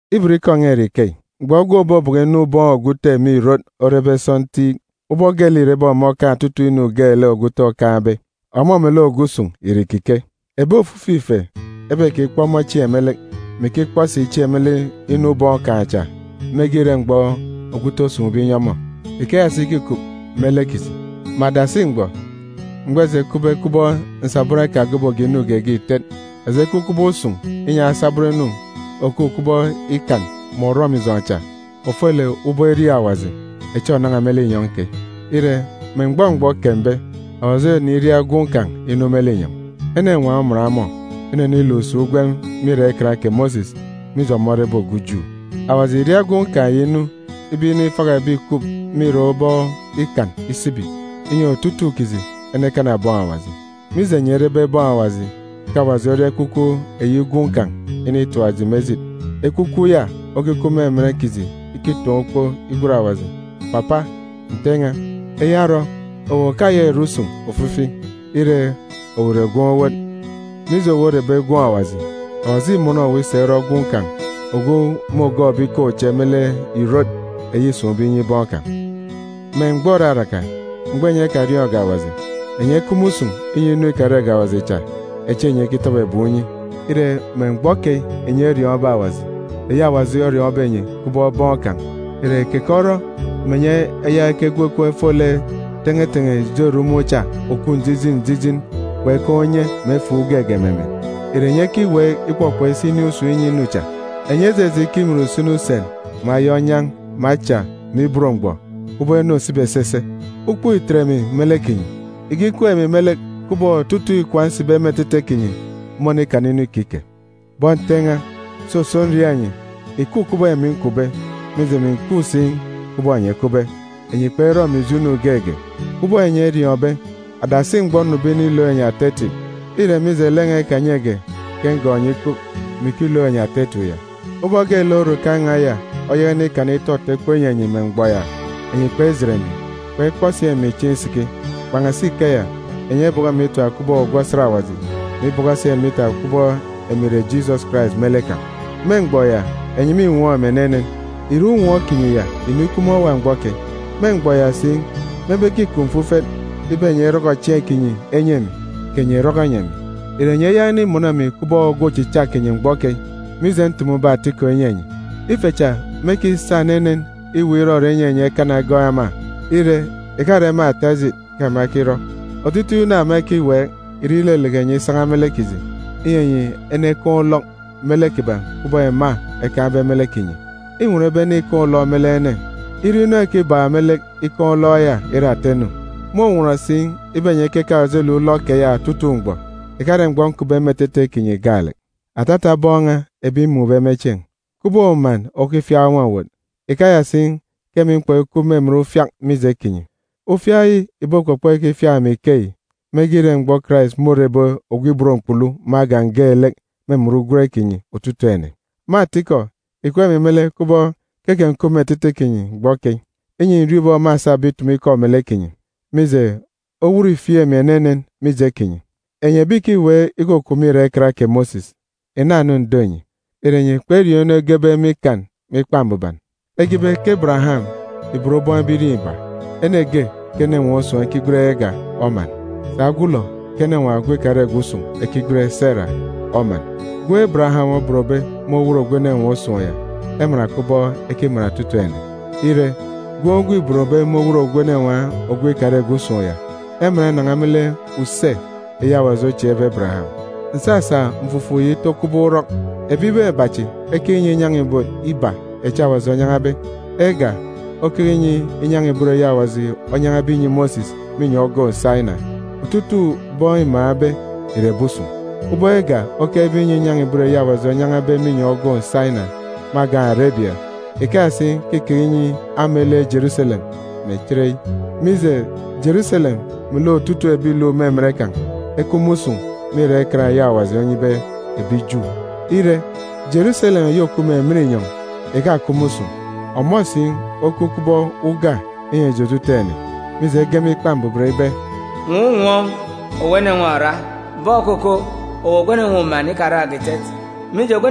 Ibot ikọ n̄a ìre ikeyi: Mgbọ gwun̄ òbobọkọ inu ubọọn̄ ogwu ute me ìrot orebe sọntiik, ubọk geelek îrebe ọmọ okaan̄ otutuuk inu geelek ogwu ute okaan̄be, ọmọ melek ogwu usun̄ ìre ìkike. Ebi ofifi ife ebekikpọ ọmọ chieen̄ me lek, mè ikikpọ si chieen̄ me lek inu ubọọn̄ kan̄ cha mege ire mgbọ ogwu ute osun̄be inyi ọmọ. Ikeya si ke îkup me lek kiji. Me adasi mgbọ, mgbọ eji ekupbe kubọk nsabọn ekagoboge inu geege ìtet, eji ekup kubọk usun̄ inyi asabọn inu òkup kubọk ikan mè orọmijọn̄ cha, ofolek ubọk iriaak Awaji, echi ònan̄a me linyọn̄ keyi. Ire, me mgbọ mgbọ okembe, Awaji oneniria Gwun̄ kan̄ inu me linyọn̄. Enenwaan̄ oman ọmọ, ineniluk si ugwem me irak Ikan kè Mosis, mije ọmọ orebe ogwu Ju. Awaji ìria Gwun̄ kan̄ yi inu ibe inifaka ebi ìkup me irak ubọk Ikan isibi, inyi otutuuk kiji enekana bọn Awaji. Mije enyi erebe bọn Awaji, ke Awaji oria Ekwukwu Gwun̄ kan̄ initap eji me ejit. Ekwukwu ya okikup me emen kiji ikitaan̄ ukpo igwen Awaji, “Papa! Nte n̄a!” Eya orọ, owu òkayaka ìre usun̄ ofifi. Ire, owu ìre gwun̄ owot. Mije owu orebe gwun̄ Awaji, Awaji îmọnọ owu isa irọ gwun̄ kan̄ ogwu môgọọkbe ikaan̄ uche me lek ìrot eyi îsun̄be inyi bọn kan̄. Me mgbọ òraraka, mgbọ enyi ekariọọn̄ge Awaji, enyi ekup me usun̄ inyi asabọn awaji cha echi kpekaan̄ ugwem geege. Ire, me mgbọ keyi enyi eriọọn̄be Awaji, eyi Awaji oriọọn̄be enyi kubọk bọn kan̄, ìre keke orọ mè enyi eyaka ekegwu ekom efo lek ikan mè orọmijọn̄ cha òkup njijin njijin, kpekaan̄ unye mè efuuk geege me emen? Ìre enyi ekiweek ikpọkpọk isi inin̄ usun̄ inyi inu cha? Enyi ejeje ikimin usini usen, mè aya onyan̄, mè acha, mè ibot mgbọ, kubọk inu òsibi esese? Ukpook îtet emi me lek kinyi! Ìkikup emi me lek kubọk otutuuk ikwaan̄ nsibe me etete kinyi mônikana inu ikike. Bọn Nte n̄a, soso, nriaak enyi, ìkup kubọk emi nkupbe, mije, emi ǹkup si kubọk enyi ekupbe. Enyi kperọ emi ijo inu geege. Kubọk enyi eriọọn̄be, adasi mgbọ nnube inilook enyi ata etip, îre mije lek n̄a ikanyege ke ngọọk enyi ikup, mè ikilook enyi ata etip ya. Ubọk geelek orukan̄ n̄a ya oyaka inikana ntọ-mkpọ inyi enyi me mgbọ ya, enyi kpejit emi, kpekpọ si emi chieen̄ isiki. Kpan̄asi ikeya, enyi ebọkọ emi itap kubọk ogwu osat Awaji, mè ibọkọ si emi itap kubọk emi ìre Jisọs Karais me lek kan̄. Me mgbọ ya, enyi mînwọọn̄ emi enenen. Ìre unwọọn̄ kinyi ya ìnikup me owa mgbọ keyi? Me mgbọ ya si, mebe ke îkup mfufet ibe enyi erọkọ chieen̄ kinyi enyi emi, kè enyi èrọkọ enyi emi. Ìre enyi eyaka inimọnọ emi kubọk ogwu ochicha kinyi mgbọ keyi, mije ntumube atikọ inyi enyi? Ife cha mêkisa enenen iweek irọrọ inyi enyi ekana egọọk ema. Ire, ìkare me ata ejit ke ema ekirọ. Otutuuk inu ema ekiweek ìre ileleke enyi isan̄a me lek kiji, inyi enyi enekaan̄ ulọk me lek kiban̄ kubọk ema ekaan̄be me lek kinyi. Înwọn ibe ene ikaan̄ ulọk me lek ene, ire inu ekibak me lek ikaan̄ ulọk ya ire ata inu. Mônwọn si ibe enyi ekekaan̄ ojelek ulọk keya otutuuk mgbọ, ìkare mgbọ nkupbe me etete kinyi gaalek. Atata bọn n̄a ebi mmun̄be me chieen̄, ike uman okifiak nwa-owot, ikeya si ke emi mkpọk ikup me emen ufiak mije kinyi. Ufiak yi ìbokpọkpọ ikifiak emi ikeyi mege ire mgbọ Karais môrebe ogwu ibot mkpulu me agan̄ geelek me emen ugwem kinyi otutuuk ene. Me atikọ, ìkup emi me lek kubọk ke kè ǹkup me etete kinyi mgbọ keyi, inyi ǹriọọn̄ ubọk mâsabe itumu ikọ melek kinyi. Mije, owot îfieek emi enenen mije kinyi. Enyi ebi ìkiweek ikukup me irak Ikan kè Mosis, ìna-nu ǹdo enyi! Ìre enyi kperiọọn̄ inu egebe me Ikan me Ikpa Mbuban? Ege ibe ke Ebereyam ìbon bọn ebirieen̄ iba. Ene ge ke enenwaan̄ usun̄, ekigwen Ega, oman. Sà ogwulọ ke enenwaan̄ ogwu ikarege usun̄, ekigwen Sera, oman. Gwun̄ Ebereyam obonbe me owot ogwu enenwaan̄ usun̄ ya, eman kubọk ekiman otutuuk ene. Ire, gwun̄ ogwu îbonbe me owot ogwu enenwaan̄ ikarege usun̄ ya, eman inan̄a me lek use eyi Awaji ochieekbe Ebereyam. Ǹsasa mfufuk yi ito kubọk urọk. Ebibaan̄ iba chi ekeke inyi inyan̄a-ibot iba echi Awaji onyan̄abe. Ega, okeke inyi inyan̄a-ibot eyi Awaji onyan̄abe inyi Mosis me inyọn̄ ogoon̄ Saina. Otutuuk bọn îmaan̄be ìre ebi usun̄. Ubọk Ega okekebe inyi inyan̄a-ibot eyi Awaji onyan̄abe me inyọn̄ ogoon̄ Saina me agan̄ Arebia, ikeya si ke îkeke inyi ama ile Jeruselem me chereyi. Mije, Jeruselem melek otutuuk ebi ìluk me emen kan̄, ekup me usun̄ me irak Ikan eyi Awaji onyibe ebi Ju. Ire, Jeruselem eyi òkup me emen inyọn̄ ìkakup me usun̄. Ọmọ si okup kubọk uga inyi eji otutuuk ene. Mije, ege me Ikpa Mbuban ibe, “Nwọọn̄ unwọọn̄, owu enenwaan̄ òra! Bọn̄ okoko, owu ogwu enenwaan̄ uman ikarakge ìtet! Mije,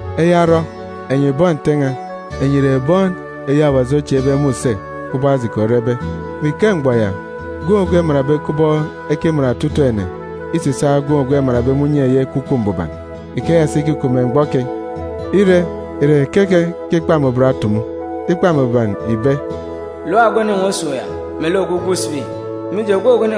Eya orọ, enyi bọn Nte n̄a, enyi ìre bọn echi Awaji ochieekbe me use, kubọk Ajiki orebe. Me ike mgbọ ya, gwun̄ ogwu emanbe kubọk ekiman otutuuk ene îsisaak gwun̄ ogwu emanbe me unye eyi Ekwukwu Mbuban. Ikeya si ke îkup me mgbọ keyi. Ire, ìre keke ke Ikpa Mbuban otumu? Ikpa Mbuban ìbe, “Lap ogwu enenwaan̄ usun̄ ya, melek ogwu gwun̄ sibi. Mije,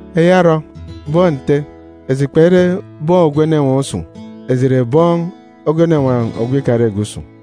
Eya orọ, bọn Nte, eji kpere bọn ogwu enenwaan̄ usun̄. Eji ìre bọn ogwu enenwaan̄ ikarege usun̄.